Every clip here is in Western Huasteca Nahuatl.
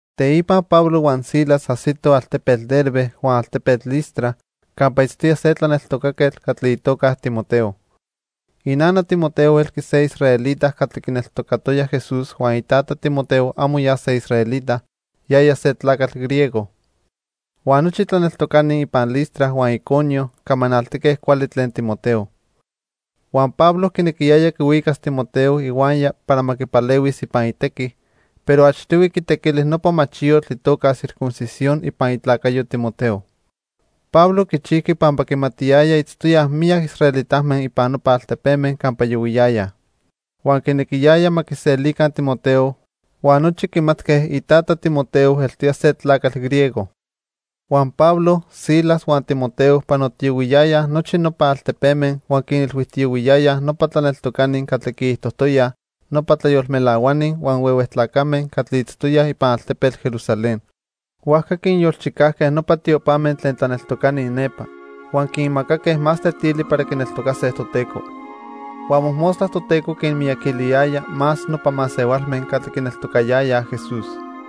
Teipa Pablo huan Silas ajsitoj altepetl Derbe huan altepetl Listra campa itztoya se tlaneltocaquetl catli itoca Timoteo. Inana Timoteo elqui se israelita catli quineltocatoya Jesús huan itata Timoteo amo ya se israelita, yaya se tlacatl griego. Huan nochi tlaneltocani ipan Listra huan Iconio camanaltique cuali tlen Timoteo. Huan Pablo quinequiyaya quihuicas Timoteo ihuaya para ma quipalehuis ipan itequi, pero achtihui quitequili nopa machiyotl itoca circuncisión ipan itlacayo Timoteo. Pablo quichijqui pampa quimatiyaya itztoyaj miyac israelitame ipan nopa altepeme campa yohuiyayaj. Huan quinequiyaya ma quiselica Timoteo, huan nochi quimatque itata Timoteo eltoya se tlacatl griego. Huan Pablo, Silas huan Timoteo panotiyohuiyayaj nochi nopa altepeme huan quinilhuijtiyohuiyayaj nopa tlaneltocani catli quiijtojtoyaj nopa tlayolmelahuani huan huehue tlacame catli itztoyaj ipan altepetl Jerusalén. Huajca quinyolchicajque nopa tiopame tlen tlaneltocani nepa huan quinmacaque más tetili para quineltocase Toteco. Huan mojmostla Toteco quinmiyaquiliyaya más nopa masehualme catli quineltocayayaj Jesús.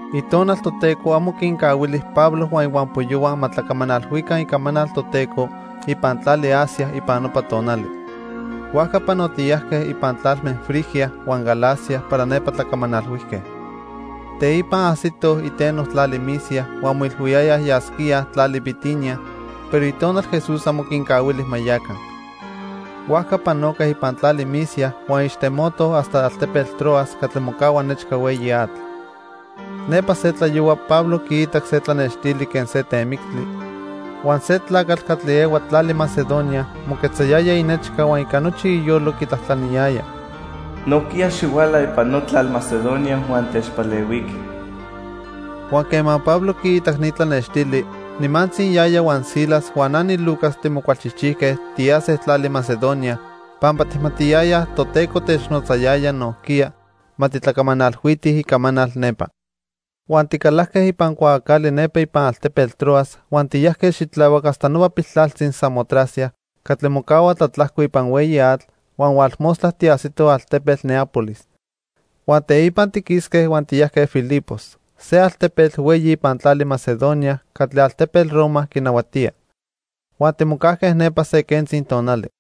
Itonal Toteco amo quincahuili Pablo huan ihuampoyohua ma tlacamanalhuica icamanal Toteco ipan tlali Asia ipan nopa tonali. Huajca panotiyajque ipan tlalme Frigia huan Galacia para nepa tlacamanalhuijque. Teipa ajsitoj iteno tlali Misia huan moilhuiyayaj yasquíaj tlali Bitinia, pero Itonal Jesús amo quincahuili ma yaca. Huajca panoque ipan tlali Misia huan ixtemotoj hasta altepetl Troas catli mocahua nechca hueyi atl. Nepa se tlayohua Pablo quiitac se tlanextili quen se temictli, huan se tlacatl catli ehua tlali Macedonia moquetzayaya inechca huan ica nochi iyolo quitlajtlaniyaya: "Nojquiya xihuala ipan notlal Macedonia huan techpalehuiqui." Huan quema Pablo quiitac ni tlanextili, nimantzi yaya huan Silas huan na niLucas timocualchijchijque tiyase tlali Macedonia, pampa tijmatiyayaj Toteco technotzayaya nojquiya ma titlacamanalhuitij icamanal nepa. Huan ticalajque ipan cuaacali nepa ipan altepetl Troas huan tiyajque xitlahuac hasta nopa piltlaltzi Samotracia catli mocahua tlatlajco ipan hueyi atl, huan hualmostla tiajsitoj altepetl Neápolis. Huan teipa tiquisque huan tiyajque Filipos, se altepetl hueyi ipan tlali Macedonia catli altepetl Roma quinahuatía. Huan timocajque nepa se quentzi tonali.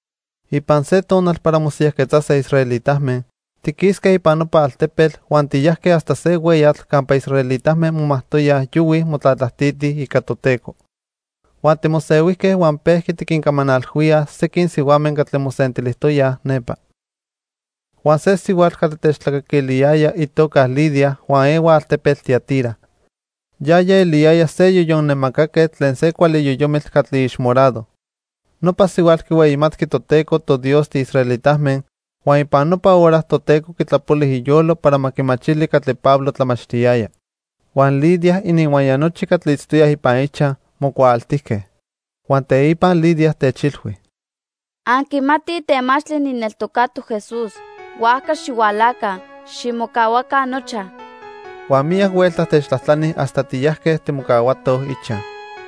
Ipan se tonal para mosiyajquetzase israelitame, tiquisque ipan nopa altepetl huan tiyajque hasta se hueyatl campa israelitame momajtoyaj yohuij motlatlajtitij ica Toteco. Huan timosehuijque huan pejqui tiquincamanalhuíaj sequin sihuame catli mosentilijtoyaj nepa. Huan se sihuatl catli techtlacaquiliyaya itoca Lidia huan ehua altepetl Tiatira. Yaya eliyaya se yoyon nemacaquetl tlen se cuali yoyomitl catli ixmorado. Nopa sihuatl quihueyimatqui Toteco toDios tiisraelitame huan ipan nopa hora Toteco quitlapoli iyolo para ma quimachili catli Pablo tlamachtiyaya. Huan Lidia ininhuaya nochi catli itztoyaj ipan ichaj mocuaaltijque. Huan teipa Lidia techilhui: —Anquimatij temachtli nijneltocatoc Jesús, huajca xihualaca, ximocahuaca nochaj. Huan miyac huelta techtlajtlani hasta tiyajque timocahuatoj ichaj.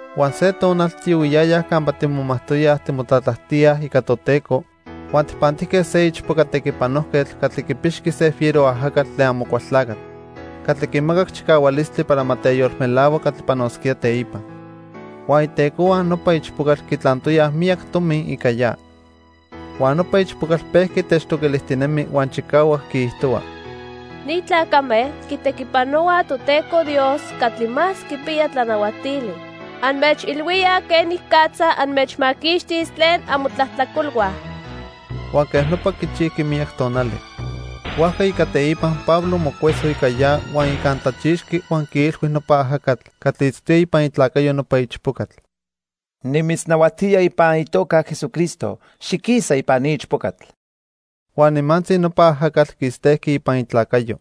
Huan se tonal tiyohuiyayaj campa timomajtoyaj timotlatlajtíaj ica Toteco huan tijpantijque se ichpoca tequipanojquetl catli quipixqui se fiero ajacatl tlen Amocualtlacatl catli quimacac chicahualistli para ma teyolmelahua catli panosquía teipa. Huan itecohua nopa ichpocatl quitlantoyaj miyac tomi ica ya. Huan nopa ichpocatl pejqui techtoquilijtinemi huan chicahuac quiijtohua: "Ni tlacame quitequipanohuaj Toteco Dios Catli Más Quipiya Tlanahuatili. Anmechilhuíaj quenicatza anmechmaquixtis tlen amotlajtlacolhua." Huan quej nopa quichijqui miyac tonali. Huajca ica teipa Pablo mocueso ica ya huan icantlachixqui huan quiilhui nopa ajacatl catli itztoya ipan itlacayo nopa ichpocatl: —Nimitznahuatía ipan itoca Jesucristo, xiquisa ipan ni ichpocatl. Huan nimantzi nopa ajacatl quistejqui ipan itlacayo.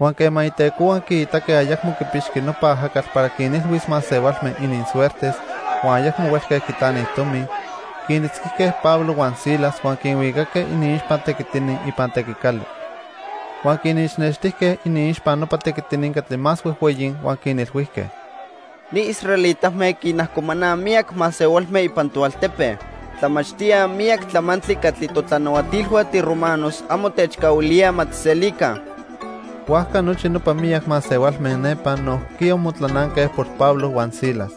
Huan quema itecohua quiitaque ayacmo quipixqui nopa ajacatl para quinilhuis masehualme ininsuertes huan ayacmo huelque quitlanij tomi, quinitzquijque Pablo huan Silas huan quinhuicaque iniixpa tequitini ipan tequicali. Huan quinixnextijque iniixpa nopa tequitini catli más huejhueyi huan quinilhuijque: —Ni israelitame quinajcomanaj miyac masehualme ipan toaltepe. Tlamachtíaj miyac tlamantli catli totlanahuatilhua tiromanos amo techcahuilíaj ma tijselica. Huajca nochi nopa miyac masehualme nepa nojquiya motlananque por Pablo huan Silas.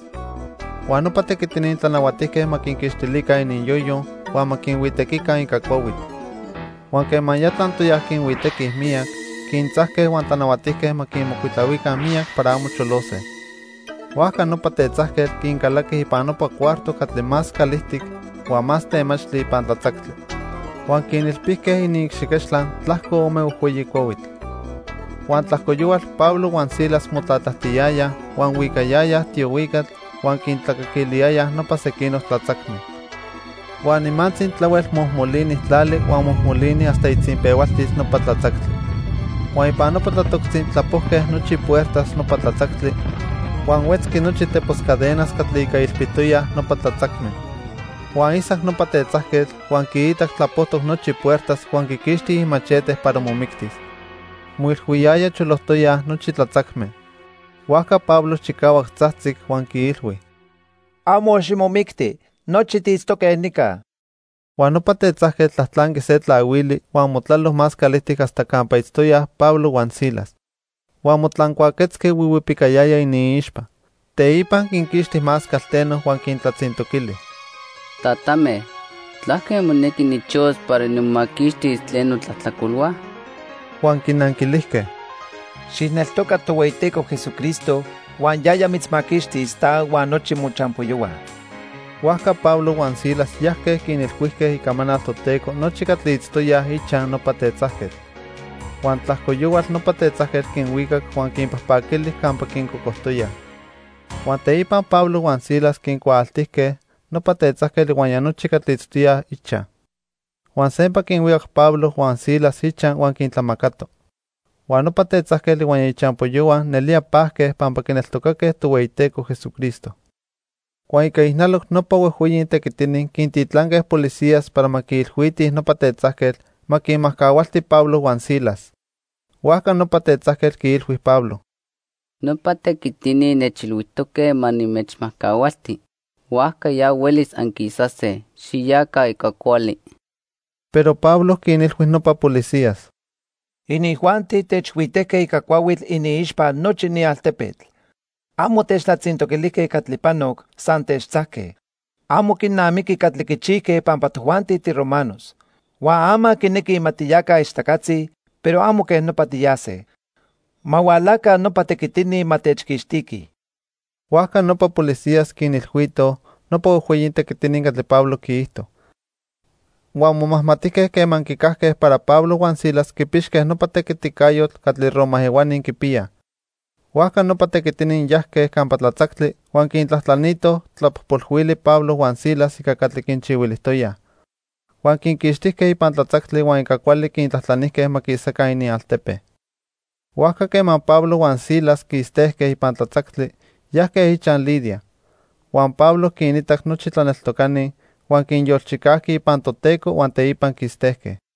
Huan nopa tequitini tlanahuatijque ma quinquixtilica ininyoyo, huan ma quinhuitequica ica cuahuitl. Huan quema ya tlantoyaj quinhuitequij miyac, quintzajque huan tlanahuatijque ma quinmocuitlahuica miyac para amo cholose. Huajca nopa tetzajquetl quincalaqui ipan nopa cuarto catli más calijtic huan más temachtli ipan tlatzactli. Huan quinilpijque iniicxiquechtla tlajco ome huejhueyi cuahuitl. Huan tlajco yohual Pablo huan Silas motlatlajtiyayaj huan huicayayaj tiohuicatl huan quintlacaquiliyayaj nopa sequinoc tlatzacme. Huan nimantzi tlahuel mojmolini tlali huan mojmolini hasta itzinpehualtil nopa tlatzactli. Huan ipan nopa tlatoctzi tlapojque nochi ipuertas nopa tlatzactli huan huetzqui nochi tepos cadenas catli ica ilpitoyaj nopa tlatzacme. Huan isac nopa tetzajquetl, huan quiitac tlapojtoc nochi puertas huan quiquixti imachete para momictis. Moilhuiyaya cholojtoyaj nochi tlatzacme. Huajca Pablo chicahuac tzajtzic huan quiilhui: —Amo ximomicti. Nochi tiitztoque nica. Huan nopa tetzajquetl tlajtlanqui se tlahuili huan motlalo más calijtic hasta campa itztoyaj Pablo huan Silas. Huan motlancuaquetzqui huihuipicayaya iniixpa. Teipa quinquixti más calteno huan quintlatzintoquili: —Tatame, ¿tlaque monequi nijchihuas para nimomaquixtis tlen notlajtlacolhua? Huan quinanquilijque: —Xijneltoca Tohueyiteco Jesucristo, huan yaya mitzmaquixtis, ta huan nochi mochampoyohua. Huajca Pablo huan Silas yajque quinilhuijque icamanal Toteco nochi catli itztoyaj ichaj nopa tetzajquetl. Huan tlajco yohual nopa tetzajquetl quinhuicac huan quinpajpaquili campa quincocojtoyaj. Huan teipa Pablo huan Silas quincuaaltijque nopa tetzajquetl ihuaya nochi catli itztoyaj ichaj. Huan sempa quinhuicac Pablo huan Silas ichaj huan quintlamacato. Huan nopa tetzajquetl ihuaya ichampoyohua nelía pajque pampa quineltocaque Tohueyiteco Jesucristo. Huan ica ijnaloc nopa huejhueyi tequitini quintitlanque policías para ma quiilhuitij nopa tetzajquetl ma quinmajcahualti Pablo huan Silas. Huajca nopa tetzajquetl quiilhui Pablo: —Nopa tequitini nechilhuijtoque ma nimechmajcahualti. Huajca ya huelis anquisase. Xiyaca ica cuali. Pero Pablo quinilhui nopa policías: —Inijuanti techhuitejque ica cuahuitl iniixpa nochi ni altepetl. Amo techtlatzintoquilijque catli panoc, san techtzajque. Amo quinamiqui catli quichijque pampa tojuanti tiromanos. Huan ama quinequij ma tiyaca ichtacatzi, pero amo quej nopa tiyase. Ma hualaca nopa tequitini ma techquixtiquij. Huajca nopa policías quinilhuitoj nopa huejhueyi tequitini catli Pablo quiijto. Huan momajmatijque quema quicajque para Pablo huan Silas quipixque nopa tequiticayotl catli Roma ehuani quipiyaj. Huajca nopa tequitini yajque campa tlatzactli huan quintlajtlanitoj tlapojpolhuili Pablo huan Silas ica catli quinchihuilijtoyaj. Huan quinquixtijque ipan tlatzactli huan ica cuali quintlajtlanijque ma quisaca inialtepe. Huajca quema Pablo huan Silas quistejque ipan tlatzactli, yajque ichaj Lidia. Huan Pablo quinitac nochi tlaneltocani, huan quinyolchicajqui ipan Toteco huan teipa quistejque.